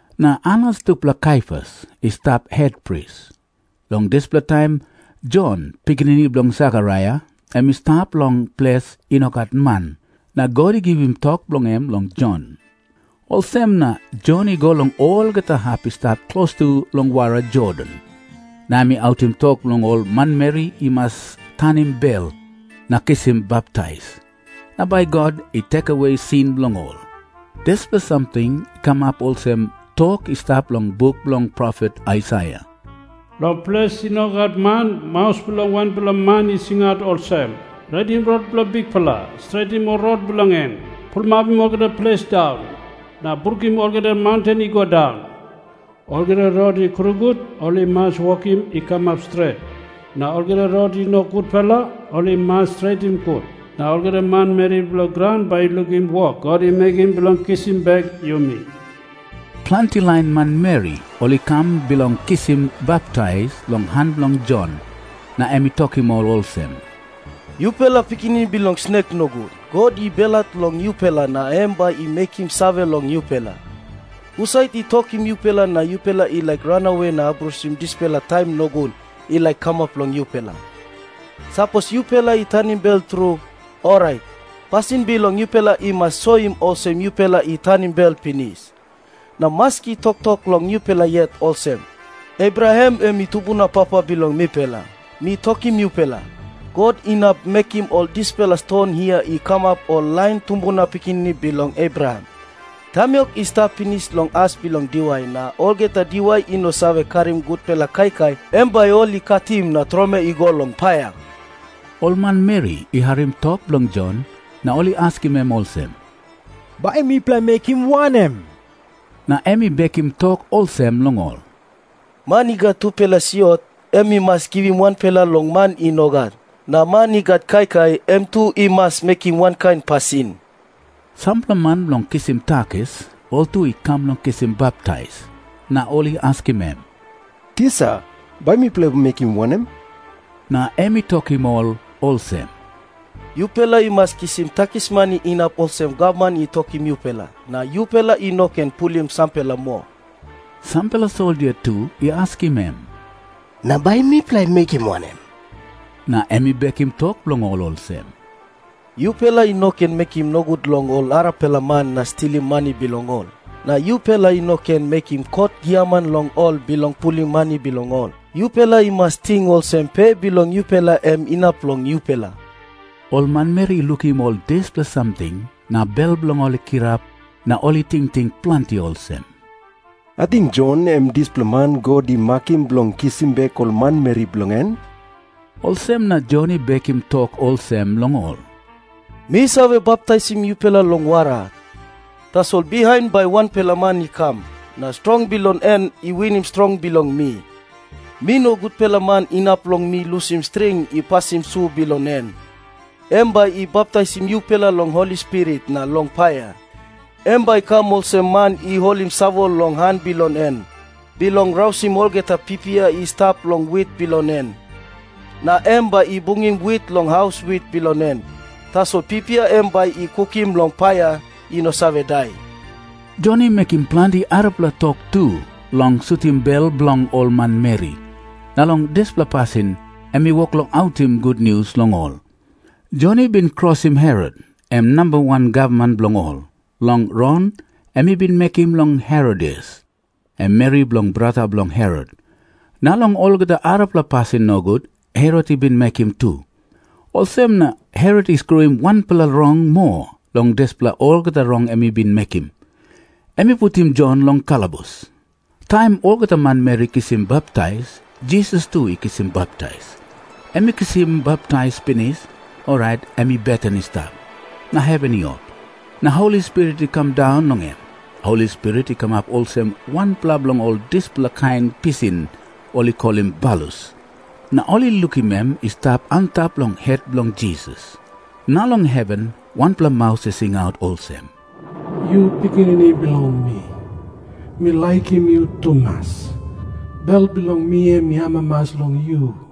Na Anas tupela Kaiafas i stap hetpris. Long dispela taim Jon, pikinini bilong Sekaraia, em i stap long ples i no gat man, na God i givim tok bilong em long Jon. Olsem na Jon i go long olgeta hap i stap klostu long wara Jordan, na em i autim tok long ol manmeri i mas tanim bel na kisim baptais, na bai God i lusim sin bilong ol. Dispela samting i kamap olsem tok i stap long buk bilong profet Aisaia, “Long ples i no gat man, maus bilong wanpela man i singaut olsem, ‘Redim rot bilong Bikpela. Stretim ol rot bilong en. Pulapim olgeta ples daun, na brukim olgeta maunten i go daun. Olgeta rot i krungut, ol i mas wokim i kamap stret. Na olgeta rot i no gutpela, ol i mas stretim gut. Na olgeta manmeri bilong graun bai i lukim wok God i mekim bilong kisim bek yumi.’” Planti lain manmeri ol i kam bilong kisim baptais long han bilong Jon, na em i tokim ol olsem, “Yupela pikinini bilong snek nogut, God i belhat long yupela na em bai i mekim save long yupela. Husat i tokim yupela na yupela i laik ranawe na abrusim dispela taim nogut i laik kamap long yupela? Sapos yupela i tanim bel tru, orait pasin bilong yupela i mas soim olsem yupela i tanim bel pinis. Na maski toktok long yupela yet olsem, ‘Abraham em i tumbuna papa bilong mipela.’ Mi tokim yupela, God inap mekim ol dispela ston hia i kamap ol lain tumbuna pikinini bilong Abraham. Tamiok i stap pinis long as bilong diwai, na olgeta diwai i no save karim gutpela kaikai, em bai ol i katim na tromoi i go long paia.” Ol manmeri i harim tok bilong Jon, na ol i askim em olsem, “Bai mipela i mekim wanem?” Na em i bekim tok olsem long ol, “Man i gat tupela siot, em i mas givim wanpela long man i no gat. Na man i gat kaikai, em tu i mas mekim wankain pasin.” Sampela man bilong kisim takis ol tu i kam bilong kisim baptais. Na ol i askim em, “Tisa, bai mipela i mekim wanem?” Na em i tokim ol olsem, “Yupela i mas kisim takismani inap olsem gavman i tokim yupela, na yupela i no ken pulim sampela moa.” Sampela soldia tu i askim em, “Na bai mipela i mekim wanem?” Na em i bekim tok bilong ol olsem, “Yupela i no ken mekim nogut long ol arapela man na stilim mani bilong ol. Na yupela i no ken mekim kot giaman long ol bilong pulim mani bilong ol. Yupela i mas ting olsem pe bilong yupela em inap long yupela.” Ol manmeri i lukim ol dispela samting na bel bilong ol i kirap na ol i tingting planti olsem, “Ating Jon em i dispela man God i makim bilong kisim bek ol manmeri bilong en?” Olsem na Jon i bekim tok olsem long ol, “Mi save baptaisim yupela long wara. Tasol bihain bai wanpela man i kam, na strong bilong en i winim strong bilong mi. Mi no gutpela man inap long mi lusim string i pasim su bilong en. Em bai i baptaisim yupela long Holi Spirit na long paia. Em bai i kam olsem man i holim savol long han bilong en, bilong rausim olgeta pipia i stap long wit bilong en. Na em bai i bungim wit long haus wit bilong en. Tasol pipia em bai i kukim long paia i no save dai.” Jon i mekim planti arapela tok tu bilong sutim bel bilong ol manmeri, na long dispela pasin em i wok long autim gutnius long ol. Jon i bin krosim Herot, em namba wan gavman bilong ol, long rong em i bin mekim long Herodias, em meri bilong brata bilong Herot, na long olgeta arapela pasin nogut Herot i bin mekim tu. Olsem na Herot i skruim wanpela rong moa long dispela olgeta rong em i bin mekim. Em i putim Jon long kalabus. Taim olgeta manmeri i kisim baptais, Jisas tu i kisim baptais. Em i kisim baptais pinis, orait em i beten i stap, na heven i op, na Holi Spirit i kam daun long em. Holi Spirit i kamap olsem wanpela bilong ol dispela kain pisin ol i kolim balus, na ol i lukim em i stap antap long het bilong Jisas. Na long heven wanpela maus i singaut olsem, “Yu Pikinini bilong mi. Mi laikim yu tumas. Bel bilong mi em i amamas long yu.”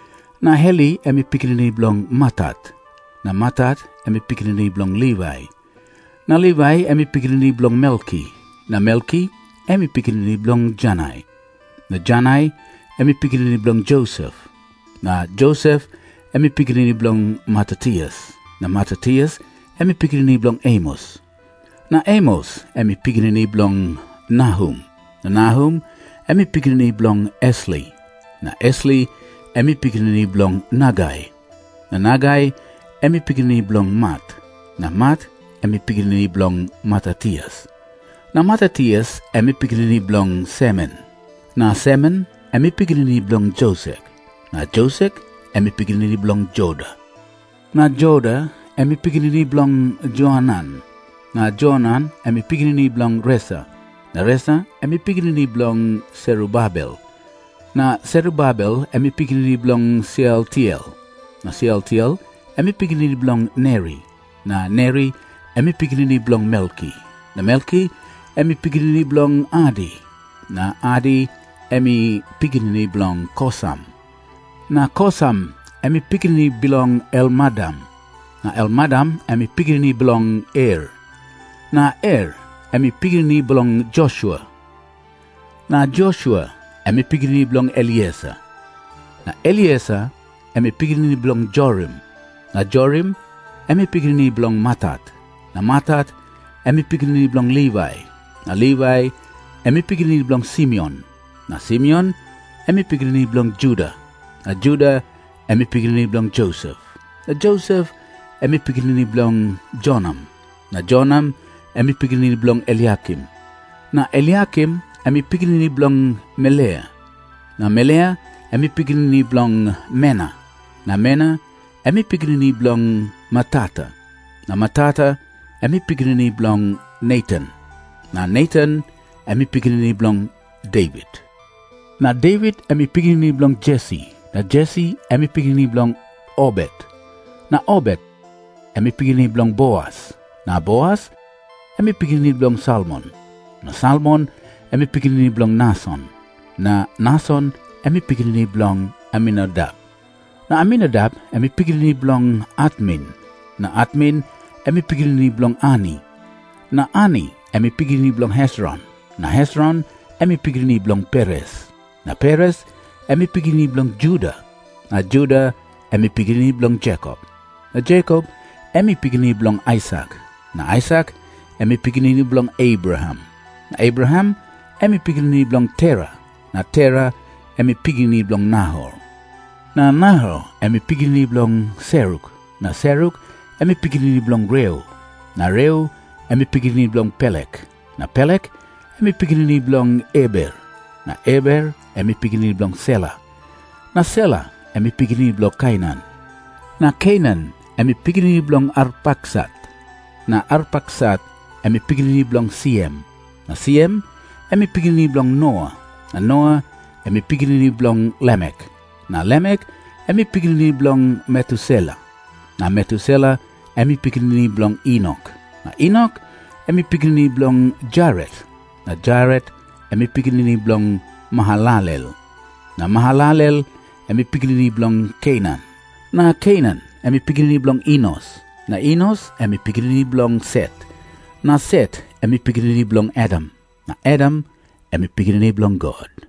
Na Heli em i pikinini bilong Matat. Na Matat em i pikinini bilong Livai. Na Livai em i pikinini bilong Melki. Na Melki em i pikinini bilong Janai. Na Janai em i pikinini bilong Josep. Na Josep em i pikinini bilong Matatias. Na Matatias em i pikinini bilong Amos. Na Amos em i pikinini bilong Nahum. Na Nahum em i pikinini bilong Esli. Na Esli em i pikinini bilong Nagai. Na Nagai em i pikinini bilong Mat. Na Mat em i pikinini bilong Matatias. Na Matatias em i pikinini bilong Semen. Na Semen em i pikinini bilong Josek. Na Josek em i pikinini bilong Joda. Na Joda em i pikinini bilong Joanan. Na Joanan em i pikinini bilong Resa. Na Resa em i pikinini bilong Serubabel. Na Serubabel em i pikinini bilong Sealtiel. Na Sealtiel em i pikinini bilong Neri. Na Neri em i pikinini bilong Melki. Na Melki em i pikinini bilong Adi. Na Adi em i pikinini bilong Kosam. Na Kosam em i pikinini bilong Elmadam. Na Elmadam em i pikinini bilong Er. Na Er em i pikinini bilong Josua. Na Josua em i pikinini bilong Elieser. Na Elieser em i pikinini bilong Jorim. Na Jorim em i pikinini bilong Matat. Na Matat em i pikinini bilong Livai. Na Livai em i pikinini bilong Simeon. Na Simeon em i pikinini bilong Juda. Na Juda em i pikinini bilong Josep. Na Josep em i pikinini bilong Jonam. Na Jonam em i pikinini bilong Eliakim. Na Eliakim em i pikinini bilong Melea. Na Melea em i pikinini bilong Mena. Na Mena em i pikinini bilong Matata. Na Matata em i pikinini bilong Natan. Na Natan em i pikinini bilong Devit. Na Devit em i pikinini bilong Jesi. Na Jesi em i pikinini bilong Obet. Na Obet em i pikinini bilong Boas. Na Boas em i pikinini bilong Salmon. Na Salmon em i pikinini bilong Nason. Na Nason em i pikinini bilong Aminadap. Na Aminadap em i pikinini bilong Atmin. Na Atmin em i pikinini bilong Arni. Na Arni em i pikinini bilong Hesron. Na Hesron em i pikinini bilong Peres. Na Peres em i pikinini bilong Juda. Na Juda em i pikinini bilong Jekop. Na Jekop em i pikinini bilong Aisak. Na Aisak em i pikinini bilong Abraham. Na Abraham em i pikinini bilong Tera. Na Tera em i pikinini bilong Nahor. Na Nahor em i pikinini bilong Seruk. Na Seruk em i pikinini bilong Reu. Na Reu em i pikinini bilong Pelek. Na Pelek em i pikinini bilong Eber. Na Eber em i pikinini bilong Sela. Na Sela em i pikinini bilong Kainan. Na Kainan em i pikinini bilong Arpaksat. Na Arpaksat em i pikinini bilong Siem. Na Siem em i pikinini bilong Noa. Na Noa em i pikinini bilong Lamek. Na Lamek em i pikinini bilong Metusela. Na Metusela em i pikinini bilong Enok. Na Enok em i pikinini bilong Jaret. Na Jaret em i pikinini bilong Mahalalel. Na Mahalalel em i pikinini bilong Kenan. Na Kenan em i pikinini bilong Enos. Na Enos em i pikinini bilong Set. Na Set em i pikinini bilong Adam. Na Adam em i pikinini bilong God.